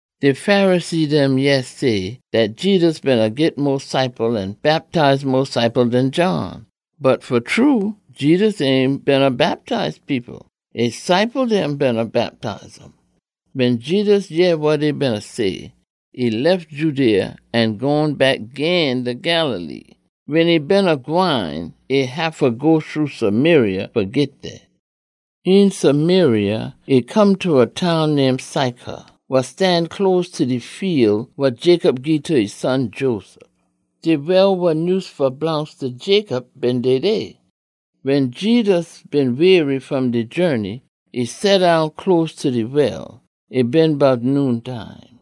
De Pharisee dem yeh say dat Jedus beena git mo ciple an bactize mo ciple den John. (Bot fa true, Jedus ain beena bactize people. E ciple dem beena bactize um.) Wen Jedus yeh wa dey beena say, e lef Judea an gone back gin ta Galilee. Wen e beena gwine, e haffa go shru Samaria fa git dey. Een Samaria, e come ta a town name Sychar, wa stan close ta de fiel wa Jacob gii ta e son Joseph. De well wa nyuse fa blongst ta Jacob been dey dey. Wen Jedus been weary fom de journey, e seddown close ta de well. E been bout noontime.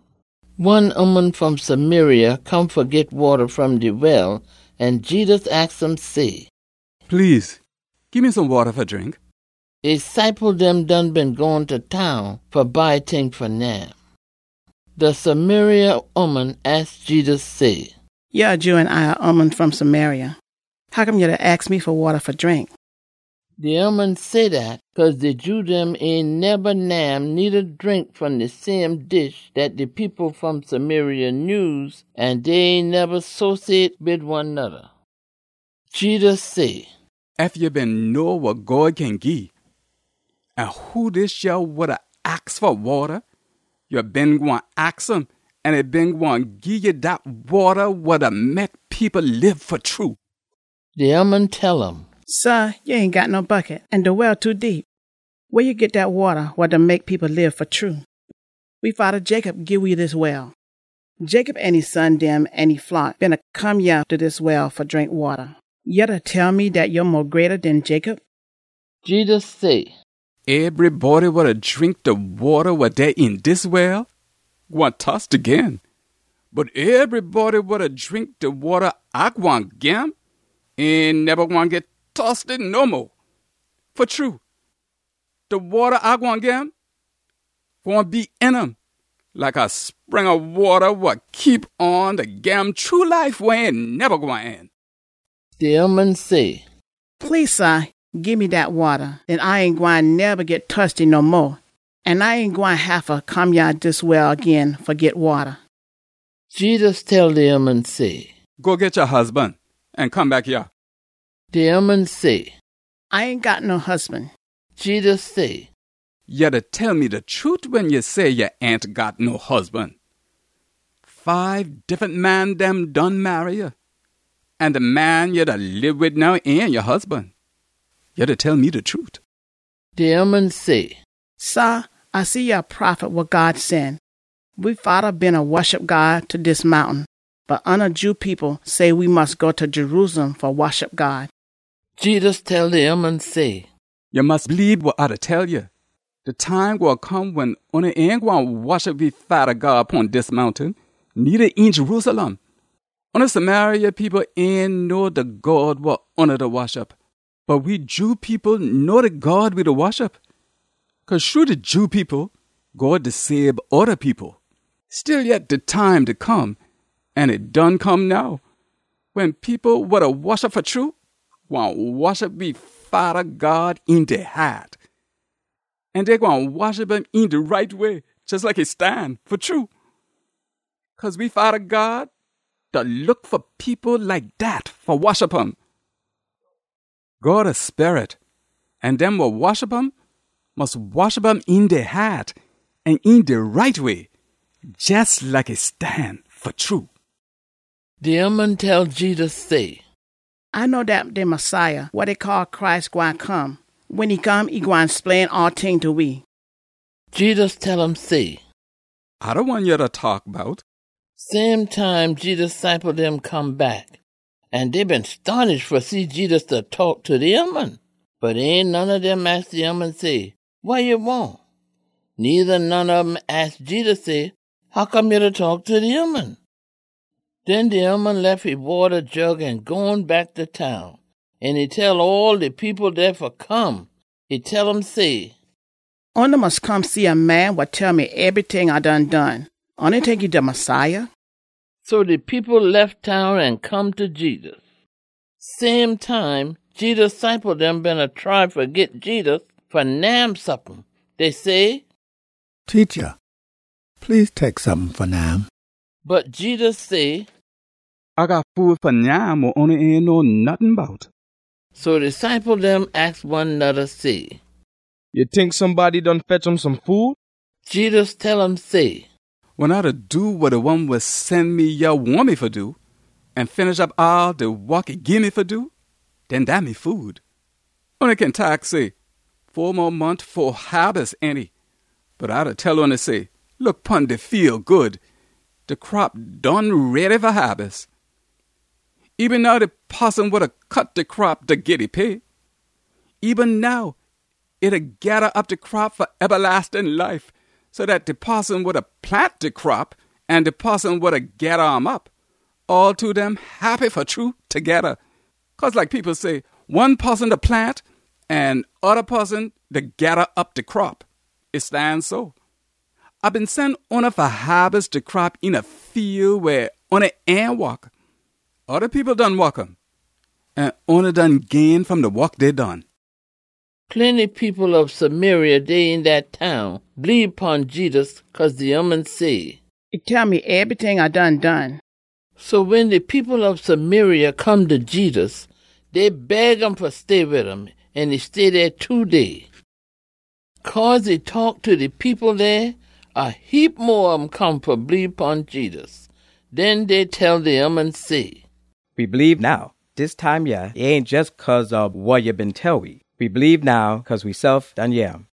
One ooman fom Samaria come fa git wata fom de well, an Jedus aks um say, “Please gii me some wata fa drink.” (E ciple dem done been gone ta town fa buy ting fa nyam.) De Samaria ooman aks Jedus say, “Ya a Jew an A a ooman fom Samaria. Hoccome ya da aks me fa wata fa drink?” (De ooman say dat cause de Jew dem ain neba nyam needa drink fom de same dish dat de people fom Samaria nyuse, an dey ain neba sociate wid one noda.) Jedus say, “Ef ya been know wa God kin gii, an who dis yah wa da aks fa wata, ya been gwine aks um an e been gwine gii ya dat wata wa da mek people lib fa true.” De ooman tell um, “Sah, ya ain got no bucket, an de well too deep. Weh ya git dat wata wa da mek people lib fa true? We fada Jacob gii we dis well. Jacob an e son dem an e flock beena come yah ta dis well fa drink wata. Ya da tell me dat ya mo greata den Jacob?” Jedus say, “Ebrybody wa da drink de wata wa dey een dis well gwine tosty gin. Bot ebrybody wa da drink de wata A gwine gim ain neba gwine git tosty no mo. Fa true, de wata A gwine gim gwine be een um like a spring ob wata wa keep on da gim true life wa ain neba gwine end.” De ooman say, “Please sah, gii me dat wata! Den A ain gwine neba git tosty no mo, an A ain gwine haffa come yah ta dis well gin fa git wata.” Jedus tell de ooman say, “Go git ya husban an come back yah.” De ooman say, “A ain got no husban.” Jedus say, “Ya da tell me de trute wen ya say ya ain got no husban. Fibe diffunt man dem done marry ya. An de man ya da lib wid now ain ya husban. Ya da tell me de trute.” De ooman say, “Sah, A see ya a prophet wa God sen. We fada beena woshup God ta dis mountain, bot oona Jew people say we mus go ta Jerusalem fa woshup God.” Jedus tell de ooman say, “Ya mus bleebe wa A da tell ya. De time gwine come wen oona ain gwine woshup we Fada God pon dis mountain, needa een Jerusalem. Oona Samaria people ain know de God wa oona da woshup. Bot we Jew people know de God we da woshup, cause shru de Jew people, God da sabe oda people. Stillyet, de time da come, an e done come now, wen people wa da woshup fa true gwine woshup we Fada God een dey haat. An dey gwine woshup um een de right way, jes like e stan fa true. Cause we Fada God da look fa people like dat fa woshup um. God a Sperit, an dem wa woshup um mus woshup um een dey haat an een de right way, jes like e stan fa true.” De ooman tell Jedus say, “A know dat de Messiah, wa dey call Christ, gwine come. Wen e come, e gwine splain all ting ta we.” Jedus tell um say, “A de one ya da taak bout.” Same time Jedus ciple dem come back, an dey been stonish fa see Jedus da taak ta a ooman. Bot ain none ob dem aks de ooman say, “Wa ya wahn?” Needa none ob um aks Jedus say, “Hoccome ya da taak ta de ooman?” Den de ooman lef e wata jug an gone back ta town, an e tell all de people dey fa come. E tell um say, “Oona mus come see a man wa tell me ebryting A done done. Oona tink e de Messiah?” So de people lef town an come ta Jedus. Same time, Jedus ciple dem beena try fa git Jedus fa nyam sompin. Dey say, “Teacha, please, tek sompin fa nyam.” Bot Jedus say, “A got food fa nyam wa oona ain know nottin bout.” So de ciple dem aks one noda say, “Ya tink somebody done fetch um some food?” Jedus tell um say, “Wen A do wa de one wa sen me yah wahn me fa do, an finish op all de wok e gii me fa do, den dat me food. Oona kin taak say, ‘Fo mo mont fo haabis, ainty?’ Bot A da tell oona say, look pon de fiel good. De crop done ready fa haabis. Eben now de poson wa da cut de crop da git e pay. Eben now e da geda op de crop fa ebalastin life so dat de poson wa da plant de crop an de poson wa da geda um op, all two dem heppy fa true togeda. Cause like people say, ‘One poson da plant, an oda poson da geda op de crop.’ E stan so! A been sen oona fa haabis de crop een a fiel weh oona ain wok. Oda people done wok um, an oona done gain fom de wok dey done.” Plenty people ob Samaria dey een dat town bleebe pon Jedus cause de ooman say, “E tell me ebryting A done done.” So wen de people ob Samaria come ta Jedus, dey beg um fa stay wid um. An e stay dey two day. Cause e taak ta de people dey, a heap mo ob um come fa bleebe pon Jedus. Den dey tell de ooman say, “We bleebe now. Dis time yah, e ain jes cause ob wa ya been tell we. We bleebe now cause wesef done yeh um.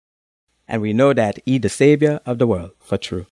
An we know dat e de Sabior ob de wol, fa true.”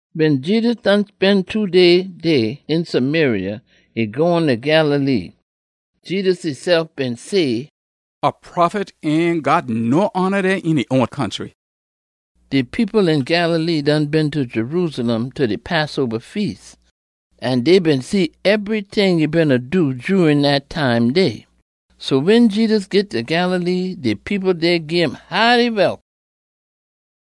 Wen Jedus done spen de two day dey een Samaria, e gone ta Galilee. Jedus esef been say, “A prophet ain got no hona dey een e own country.” De people een Galilee done been ta Jerusalem ta de Passoba Feas, an dey been see ebryting e beena do jurin dat time dey. So wen Jedus git ta Galilee, de people dey gim haaty welcome.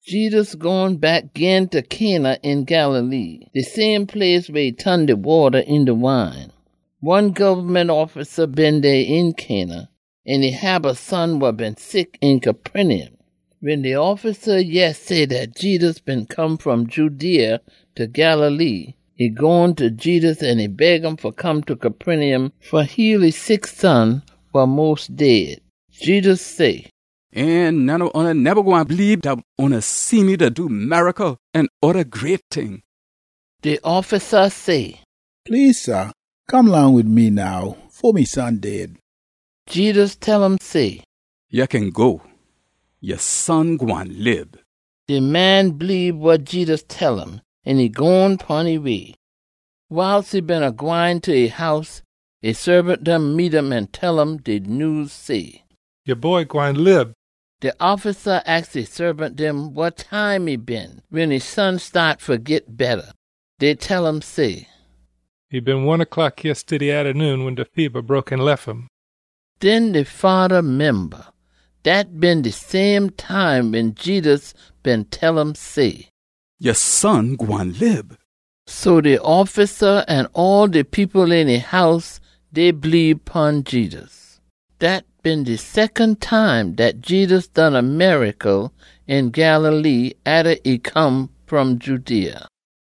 Jedus gone back gin ta Cana een Galilee, de same place weh e ton de wata eenta wine. One gobment offisa been dey een Cana, an e hab a son wa been sick een Capernaum. Wen de offisa yeh say dat Jedus been come fom Judea ta Galilee, e gone ta Jedus an e beg um fa come ta Capernaum fa heal e sick son, wa mos dead. Jedus say, “Ain none ob oona neba gwine bleebe dout oona see me da do miracle an oda great ting.” De offisa say, “Please sah, come long wid me now, fo me son dead.” Jedus tell um say, “Ya kin go. Ya son gwine lib!” De man bleebe wa Jedus tell um, an e gone pon e way. Wiles e beena gwine ta e house, e saabant dem meet um an tell um de nyews say, “Ya boy gwine lib!” De offisa aks e saabant dem wa time e been wen e son staat fa git betta. Dey tell um say, “E been one o’clock yestiddy atta noon wen de feba broke an lef um.” Den de fada memba, dat been de same time wen Jedus been tell um say, “Ya son gwine lib!” So de offisa an all de people een e house, dey bleebe pon Jedus. Dat been de secon time dat Jedus done a miracle een Galilee atta e come fom Judea.